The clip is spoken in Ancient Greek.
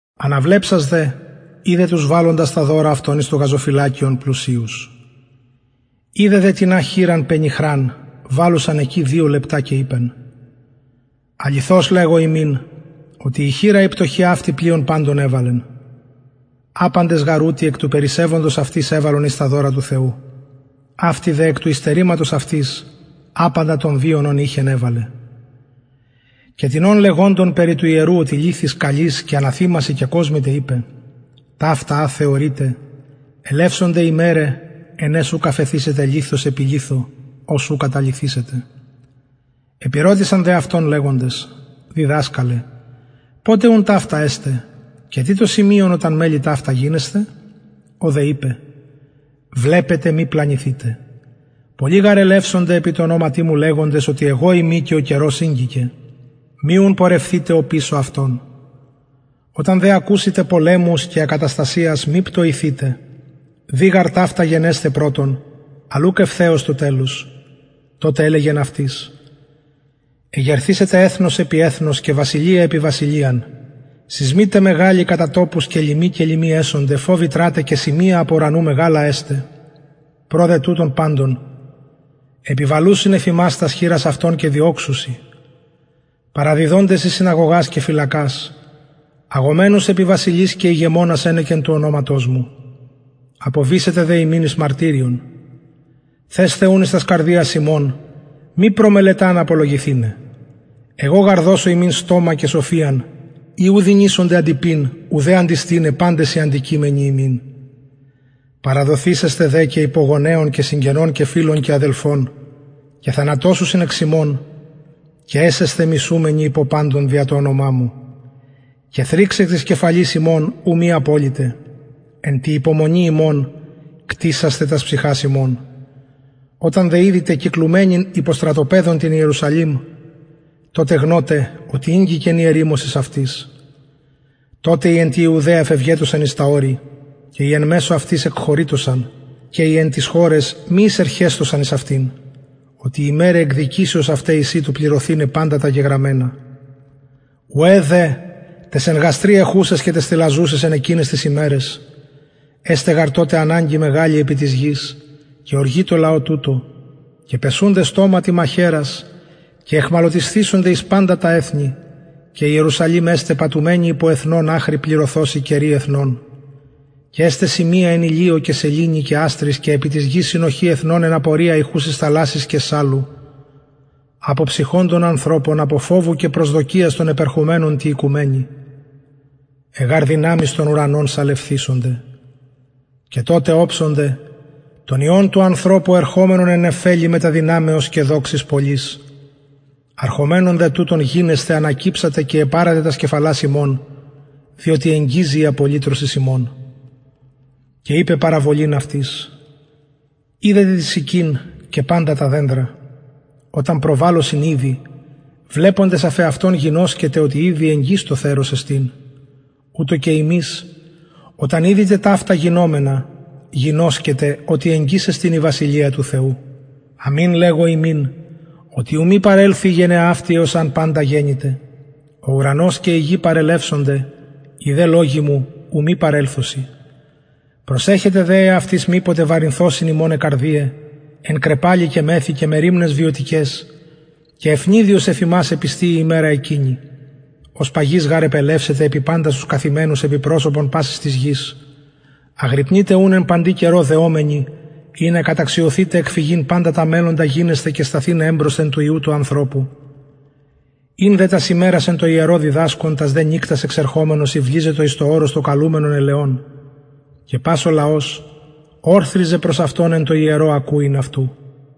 αναβλεψας δε ειδεν τους βαλλοντας τα δωρα αυτων εις το γαζοφυλακιον πλουσιους ειδεν δε τινα και χηραν πενιχραν βαλλουσαν εκει δυο λεπτα και ειπεν αληθως λεγω υμιν οτι η χηρα η πτωχη αυτη πλειον παντων εβαλεν απαντες γαρ ουτοι εκ του περισσευοντος αυτοις εβαλον εις τα δωρα του θεου αυτη δε εκ του υστερηματος αυτης απαντα τον βιον ον ειχεν εβαλεν και τινων λεγοντων περι του ιερου οτι λιθοις καλοις και αναθημασιν κεκοσμηται ειπεν ταυτα α θεωρειτε ελευσονται ημεραι εν αις ουκ αφεθησεται λιθος επι λιθω ος ου καταλυθησεται επηρωτησαν δε αυτον λεγοντες διδασκαλε ποτε ουν ταυτα εσται και τι το σημειον οταν μελλη ταυτα γινεσθαι ο δε ειπεν βλεπετε μη πλανηθητε πολλοι γαρ ελευσονται επι τω ονοματι μου λεγοντες οτι εγω ειμι και ο καιρος ηγγικεν μη ουν πορευθητε οπισω αυτων οταν δε ακουσητε πολεμους και ακαταστασιας μη πτοηθητε δει γαρ ταυτα γενεσθαι πρωτον αλλ ουκ ευθεως το τελος τοτε ελεγεν αυτοις εγερθησεται εθνος επι εθνος και βασιλεια επι βασιλειαν σεισμοι τε μεγαλοι κατα τοπους και λιμοι και λοιμοι εσονται φοβητρα τε και σημεια απ ουρανου μεγαλα εσται προ δε τουτων παντων επιβαλουσιν εφ υμας τας χειρας αυτων και διωξουσιν παραδιδοντες εις συναγωγας και φυλακας αγομενους επι βασιλεις και ηγεμονας ενεκεν του ονοματος μου αποβησεται δε υμιν εις μαρτυριον θεσθε ουν εις τας καρδιας υμων μη προμελεταν απολογηθηναι εγω γαρ δωσω υμιν στομα και σοφιαν η ου δυνησονται αντειπειν ουδε αντιστηναι παντες οι αντικειμενοι υμιν παραδοθησεσθε δε και υπο γονεων και συγγενων και φιλων και αδελφων και θανατωσουσιν εξ υμων και εσεσθε μισουμενοι υπο παντων δια το ονομα μου και θριξ εκ της κεφαλης υμων ου μη αποληται εν τη υπομονη υμων κτησασθε τας ψυχας υμων οταν δε ιδητε κυκλουμενην υπο στρατοπεδων την ιερουσαλημ τοτε γνωτε οτι ηγγικεν η ερημωσις αυτης τοτε οι εν τη ιουδαια φευγετωσαν εις τα ορη και οι εν μεσω αυτης εκχωρειτωσαν και οι εν ταις χωραις μη εισερχεσθωσαν εις αυτην οτι ημεραι εκδικησεως αυται εισιν του πλησθηναι παντα τα γεγραμμενα ουαι δε ταις εν γαστρι εχουσαις και ταις θηλαζουσαις εν εκειναις ταις ημεραις εσται γαρ αναγκη μεγαλη επι της γης και οργη εν τω λαω τουτω και πεσουνται στοματι μαχαιρας και αιχμαλωτισθησονται εις παντα τα εθνη και ιερουσαλημ εσται πατουμενη υπο εθνων αχρι πληρωθωσιν καιροι εθνων και εσται σημεια εν ηλιω και σεληνη και αστροις και επι της γης συνοχη εθνων εν απορια ηχουσης θαλασσης και σαλου αποψυχοντων ανθρωπων απο φοβου και προσδοκιας των επερχομενων τη οικουμενη αι γαρ δυναμεις των ουρανων σαλευθησονται και τοτε οψονται τον υιον του ανθρωπου ερχομενον εν νεφελη μετα δυναμεως και δοξης πολλης αρχομενων δε τουτων γινεσθαι ανακυψατε και επαρατε τας κεφαλας υμων διοτι εγγιζει η απολυτρωσις υμων και ειπεν παραβολην αυτοις ιδετε την συκην και παντα τα δενδρα οταν προβαλωσιν ηδη βλεποντες αφ εαυτων γινωσκετε οτι ηδη εγγυς το θερος εστιν ουτως και υμεις οταν ιδητε ταυτα γινομενα γινωσκετε οτι εγγυς εστιν η βασιλεια του θεου αμην λεγω υμιν οτι ου μη παρελθη η γενεα αυτη εως αν παντα γενηται ο ουρανος και η γη παρελευσονται οι δε λογοι μου ου μη παρελθωσιν προσεχετε δε εαυτοις μηποτε βαρηθωσιν υμων αι καρδιαι εν κραιπαλη και μεθη και μεριμναις βιωτικαις και αιφνιδιος εφ υμας επιστη η ημερα εκεινη ως παγις γαρ επελευσεται επι παντας τους καθημενους επι προσωπον πασης της γης αγρυπνειτε ουν εν παντι καιρω δεομενοι ινα καταξιωθητε εκφυγειν παντα τα μελλοντα γινεσθαι και σταθηναι εμπροσθεν του υιου του ανθρωπου ην δε τας ημερας εν τω ιερω διδασκων τας δε νυκτας εξερχομενος ηυλιζετο εις το ορος το καλουμενον ελαιων και πας ο λαος ωρθριζεν προς αυτον εν τω ιερω ακουειν αυτου